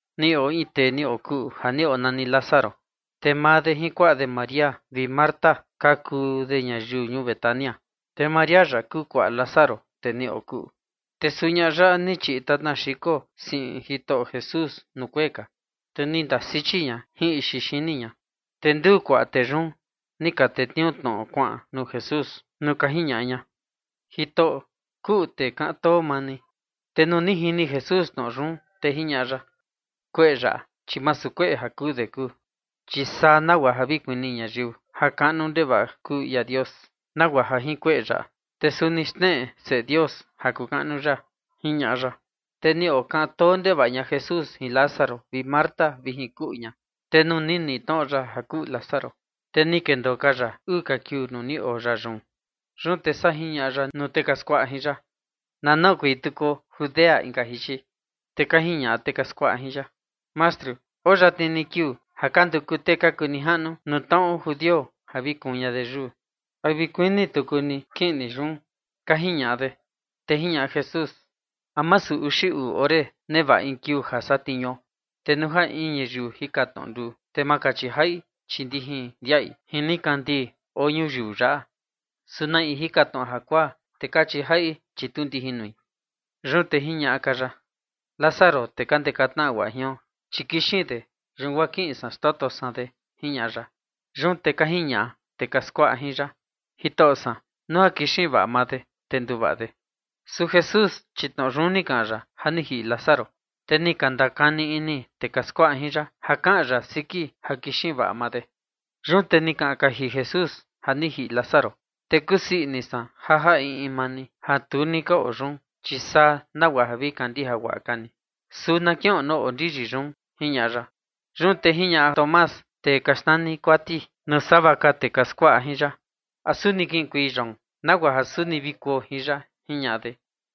Ni oo in tee ni okuꞌu ja ni onani Lázaro. Te maa de jin kuaꞌa de María vi Marta ka kuu de ñayiu ñuu Betania. Te María yaꞌa kuu kuaꞌa Lázaro tee ni okuꞌu, te suu ñaꞌa yaꞌa ni chiꞌi tatna xiko siꞌin Jitoꞌo Jesús nuu kuee ka, te ni ndasichi ña jin ixi xini ña. Te nduu kuaꞌa de yun ni ka tetniuu tnoꞌo kuaꞌan nuu Jesús nuu ka jiñaꞌa ña: ―Jitoꞌo, kuꞌu tee kaꞌan too maa ni. Te nuu ni jini Jesús tnoꞌo yun, te jiñaꞌa ya: ―Kueꞌe yaꞌa, chi masu kueꞌe ja kuu de kuu, chi saa nagua ja vi kuni ñayiu ja kaꞌnu ndevaꞌa kuu ia Dios, nagua ja jin kueꞌe yaꞌa, te suni xneꞌe Seꞌe Dios ja kuu kaꞌnu ya ―jiñaꞌa ya. Te ni okaꞌan too ndevaꞌa ña Jesús jin Lázaro vi Marta vi jin kuꞌu ña. Te nuu ni niꞌi tnoꞌo ya ja kuꞌu Lázaro, te ni kendoo ka ya uu ka kiuu nuu ni oo ya yun. Yun te saa jiñaꞌa ya nuu tee ka skuaꞌa jin ya: ―Na noꞌokuei tukuo Judea inka jichi. Te ka jiñaꞌa tee ka skuaꞌa jin ya: ―Mastru, oo yatni ni kiuu ja ka nduku tee ka kuu nijaꞌnu nuu tnaꞌo judio ja vi kuun ña de yuu, ¿te a vi kuini tuku ni kiꞌin ni yun? ―ka jiñaꞌa de. Te jiñaꞌa Jesús: ―¿A masu uxi uu ore nevaꞌa in kiuu ja satniuo? Te nuu ja in ñayiu jika tnoꞌo nduu, te ma kachi jaꞌi, chi ndijin ndiaꞌi jin nikandii oo ñuyiu yaꞌa. Su na in jika tnoꞌo jakuaa, te kachi jaꞌi, chi tu ndijin nui. Yun te jiñaꞌa ka ya: ―Lázaro, tee ka ndeka tnaꞌa guaꞌa jion, chi ni kixin de, yun guaa kiꞌin san xtoto san de ―jiñaꞌa ya. Yun te ka jiñaꞌa tee ka skuaꞌa jin ya: ―Jitoꞌo san, nuu ja kixin vaꞌa maa de, te nduvaꞌa de. Su Jesús, chi tnoꞌo yun ni kaꞌan ya ja ni jiꞌi Lázaro. Te ni ka ndakani ini tee ka skuaꞌa jin ya ja kaꞌan ya siki ja kixin vaꞌa maa de. Yun te ni kaꞌan kaji Jesús: ―Ja ni jiꞌi Lázaro. Te kusii ini san ja jaꞌa in in maa ni ja tu ni ka oo yun, chi saa nagua ja vi kandija guaꞌa ka ni, su na kiꞌon nuu oo ndiyi yun ―jiñaꞌa ya. Yun te jiñaꞌa Tomás, tee ka xnani Kuati, nuu sava ka tee ka skuaꞌa jin ya: ―¿A suni kiꞌinkuei yoon, nagua ja suni vi kuo jin ya? ―jiñaꞌa de.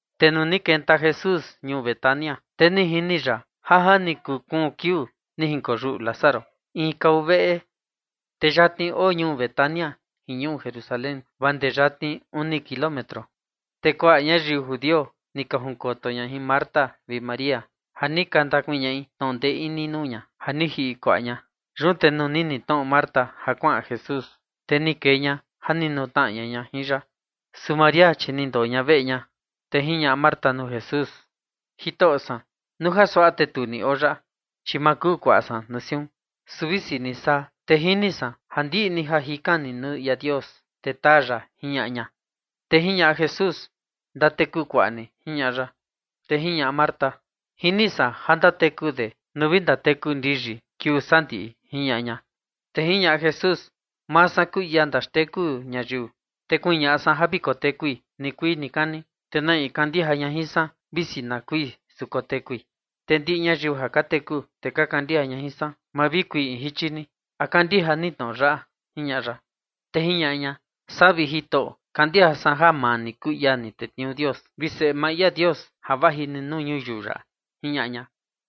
Te nuu ni kenta Jesús ñuu Betania, te ni jini ya ja ni kuu kuun kiuu ni jinkoyuꞌu Lázaro in kava veꞌe. Te yatni oo ñuu Betania jin ñuu Jerusalén, vaa ndee yatni uni kilómetro. Te kuaꞌa ñayiu judio ni ka junkoto ña jin Marta vi María, ja ni ka ndakuñaꞌi tnoꞌo ndee ini nuu ña, ja ni jiꞌi kuaꞌa ña. Yun te nuu ni niꞌi tnoꞌo Marta ja kuaꞌan Jesús, te ni kee ña ja ni nutnaꞌa ña jin ya, su María chi ni ndoo ña veꞌe ña. Te jiñaꞌa Marta nuu Jesús: ―Jitoꞌo san, nuu suaꞌa te ni oo ni yaꞌa, chi ma kuu kuaꞌa san nuu siun. Su visi ni saa, te jini san ja ndiꞌi ni ja jikan ni nuu ia Dios, te taa ya ―jiñaꞌa ña. Te jiñaꞌa Jesús: ―Ndateku kuaꞌa ni ―jiñaꞌa ya. Te jiñaꞌa Marta: ―Jini san ja ndateku de nuu vi ndateku ndiyi kiuu sandiꞌi ―jiñaꞌa ña. Te jiñaꞌa Jesús: ―Maa san kuu ia ndaxteku ñayiu, te kuñaꞌa san ja vi kotekui nikuii nikani. Te na in kandija ña jin san, visi na kui, su kotekui. Te ndiꞌi ñayiu ja ka teku, te ka kandija ña jin san, ma vi kui in jichi ni. ¿A kandija ni tnoꞌo yaꞌa? ―jiñaꞌa ya. Te jiñaꞌa ña: ―Saa, vi Jitoꞌo san, kandija san ja maa ni kuu ia ni tetniuu Dios vi Seꞌe maa ia Dios, ja vaji ni nuu ñuyiu yaꞌa ―jiñaꞌa ña.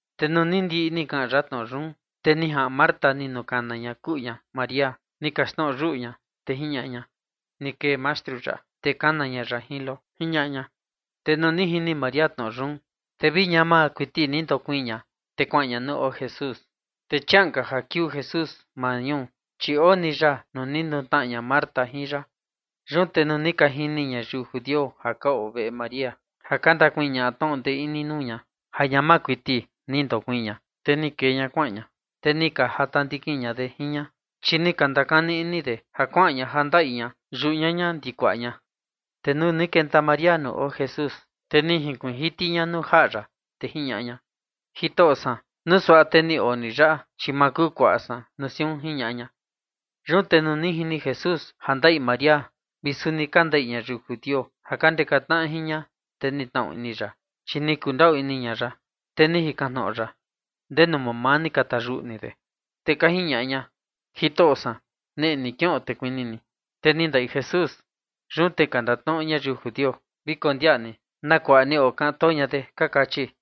Te nuu ni ndiꞌi ni kaꞌan ya tnoꞌo yun, te ni jaꞌan Marta ni nukana ña kuꞌu ña María, ni kaxtnoꞌo yuꞌu ña, te jiñaꞌa ña: ―Ni kee Mastru yaꞌa, te kana ña ya jin lo ―jiñaꞌa ña. Te nuu ni jini María tnoꞌo yun, te vi ñama kuiti ni ndakoo ña, te kuaꞌan ña nuu oo Jesús. Te chiaꞌan ka ja kiuu Jesús maa ñuu, chi oo ii ni ya nuu ni nutnaꞌa ña Marta jin ya. Yun te nuu ni ka jini ñayiu judio ja ka oo veꞌe María ja ka ndakuñaꞌa tnoꞌo ndee ini nuu ña, ja ñama kuiti ni ndakoo ña, te ni kee ña kuaꞌan ña, te ni ka jata ndikin ña de jin ña, chi ni ka ndakani ini de ja kuaꞌan ña ja ndaꞌi ña yuꞌu ñaña ndi kuaꞌa ña. Te nuu ni kenta María nuu oo Jesús, te ni junkuiin jiti ña nuu jaꞌa ya, te jiñaꞌa ña: ―Jitoꞌo san, nuu suaꞌa te ni oo ni yaꞌa, chi ma kuu kuaꞌa san nuu siun ―jiñaꞌa ña. Yun te nuu ni jini Jesús ja ndaꞌi María vi suni ka ndaꞌi ñayiu judio ja ka ndeka tnaꞌa jin ña, te ni tnaꞌu ini ya, chi ni kundaꞌu ini ña ya. Te ni jikan tnoꞌo ya: ―¿Ndenu mamaa ni ka tayuꞌu ni de? Te ka jiñaꞌa ña: ―Jitoꞌo san, neꞌe ni kiꞌon, te kuni ni. Te ni ndaꞌi Jesús. Yun te ka ndatnoꞌo ñayiu judio: ―Vi kondiaꞌa ni na kuaꞌa ni okaꞌan too ña de ―ka kachi.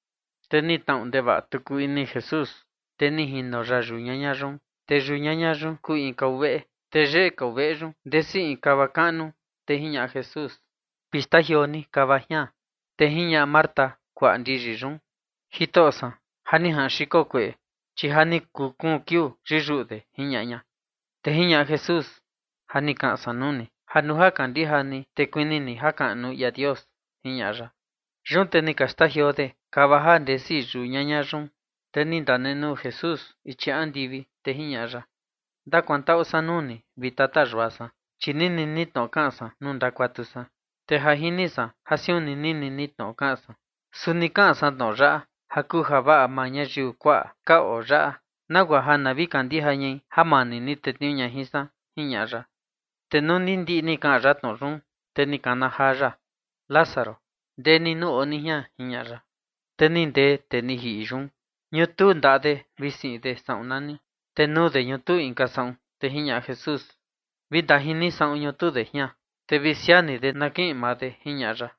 Te ni tnaꞌu ndevaꞌa tuku ini Jesús, te ni jino ya yuꞌu ñaña yun. Te yau ñaña yun kuu in kava veꞌe, te yeꞌe kava veꞌe yun ndesi in kava kaꞌnu. Te jiñaꞌa Jesús: ―Vi xtajioo ni kava jian. Te jiñaꞌa Marta, kuaꞌa ndiyi yun: ―Jitoꞌo san, ja ni jaꞌan kueꞌe, chi ja ni kuu kuun kiuu yiyuꞌu de ―jiñaꞌa ña. Te jiñaꞌa Jesús: ―Ja ni kaꞌan san nuu ni ja nuu ja kandija ni, te kuni ni jakaꞌnu ia Dios ―jiñaꞌa ya. Yun te ni ka xtajioo de kava ja ndesi yuꞌu yau ñaña yun. Te ni ndanenuu Jesús ichi andivi, te jiñaꞌa ya: ―Ndakuantaꞌu san nuu ni, vi Tata Yua san, chi nini ni tnoꞌo kaꞌan san nuu ndakuatu san. Te ja jini san ja siun ni nini ni tnoꞌo kaꞌan san, su ni kaꞌan san tnoꞌo yaꞌa ja kuu javaꞌa maa ñayiu kuaꞌa ka oo yaꞌa, nagua ja na vi kandija ñai ja maa ni ni tetniuu ña jin san ―jiñaꞌa ya. Te nuu ni ndiꞌi ni kaꞌan ya tnoꞌo yun, te ni kana jaa ya: ―Lázaro, ndee ni nuu oo ni jian ―jiñaꞌa ya. Te ni ndee ni tee ni jiꞌi yun, ñutuu ndaꞌa de vi siꞌin de saꞌun nani, te nuu de ñutuu inka saꞌun. Te jiñaꞌa Jesús: ―Vi ndajin ni saꞌun ñutuu de jian, te vi siaa ni de na kiꞌin maa de ―jiñaꞌa ya.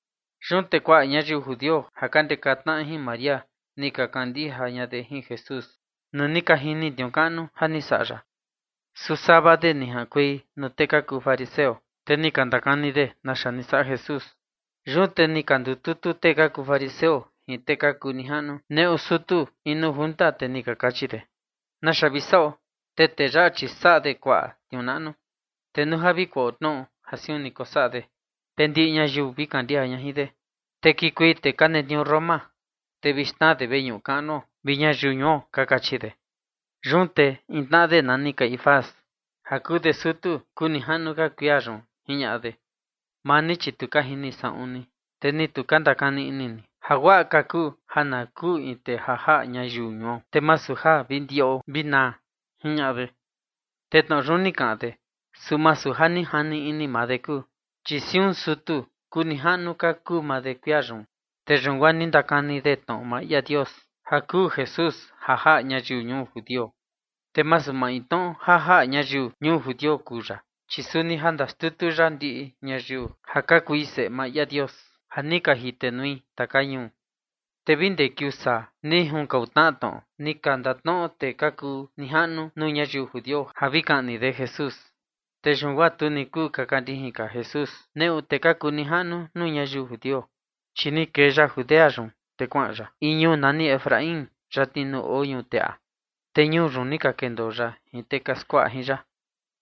Yun te kuaꞌa ñayiu judio ja ka ndeka tnaꞌa jin María ni ka kandija Jesús, nuu ni ka jini tniuu kaꞌnu ni saꞌa ya. Su sava de ni jaꞌankuei nuu tee ka kuu fariseo, te ni ka ndakani de naxa ni saꞌa Jesús. Yun te ni ka ndututu tee ka kuu fariseo jin tee ka kuu nijaꞌnu nuu sutu in nuu junta, te ni ka kachi de: ―¿Naxa vi saꞌo? Te tee yaꞌa, chi saꞌa de kuaꞌa tniuu naꞌnu. Te nuu ja vi kuaꞌo tnoꞌo ja siun ni kosaꞌa de, te ndiꞌi ñayiu vi kandija ña jin de. Te kikuei tee ka netniuu Roma, te vi xnaa de veñuꞌu kaꞌnuo vi ñayiu ñuo ―ka kachi de. Yun te in tnaꞌa de nani Caifás, ja kuu de sutu kuu nijaꞌnu ka kuia yun, jiñaꞌa de: ―Maa ni, chi tu ka jini saꞌun ni. Te ni tu ka ndakani ini ni, ja guaꞌa ka kuu ja na kuu in tee ja jaꞌa ñayiu ñuo, te masu ja vi ndiꞌo vi naa ―jiñaꞌa de. Te tnoꞌo yun ni kaꞌan de, su masu ja ni jani ini maa de kuu, chi chia siun sutu kuu nijaꞌnu ka kuu maa de kuia yun, te yun guaa ni ndakani de tnoꞌo maa ia Dios ja kuu Jesús ja jaꞌa ñayiu ñuu judio. Te masu maintnoꞌo ja jaꞌa ñayiu ñuu judio kuu ya, chi suni ja ndaxtutu ya ndiꞌi ñayiu ja ka kui seꞌe maa ia Dios ja ni ka jitenui taka ñuu. Te vi guaa ndee kiuu saa ni junkau tnaꞌa tnoꞌo ni ka ndatnoꞌo tee ka kuu nijaꞌnu nuu ñayiu judio ja vi kaꞌni de Jesús. Te yun guaa tu ni kuu kaka ndijin ka Jesús neꞌu tee ka kuu nijaꞌnu nuu ñayiu judio. Chi ni kee ya Judea yun, te kuaꞌan ya in ñuu nani Efraín, yatni nuu oo ñuꞌu teꞌa, te ñuu yun ni ka kendoo ya jin tee ka skuaꞌa jin ya.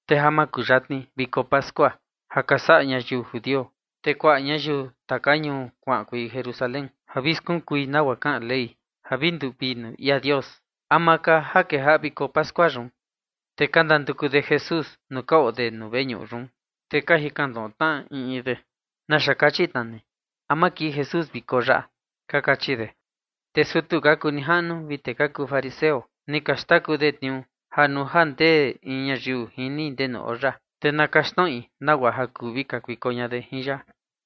Te ja ni kuyatni ja ñuꞌu viko pascua ja ka saꞌa ñayiu judio, te kuaꞌa ñayiu taka ñuu kuaꞌankuei Jerusalén ja vi skunkui nagua kaꞌan Ley ja vi nduvii nuu ia Dios, ama ka ja kejaꞌa viko pascua yun. Te ka ndanduku de Jesús nuu ka oo de nuu veñuꞌu yun, te ka jikan tnoꞌo tnaꞌa in in de: ―¿Naxa kachi tna ni? ¿A ma kii Jesús viko yaꞌa? ―ka kachi de. Te sutu ka kuu nijaꞌnu vi tee ka kuu fariseo, ni ka xtaku de tniuu ja nuu ja ndee in ñayiu jini ndenu oo ya, te na kaxtnoꞌi nagua ja kuu vi kakuiko ña de jin ya.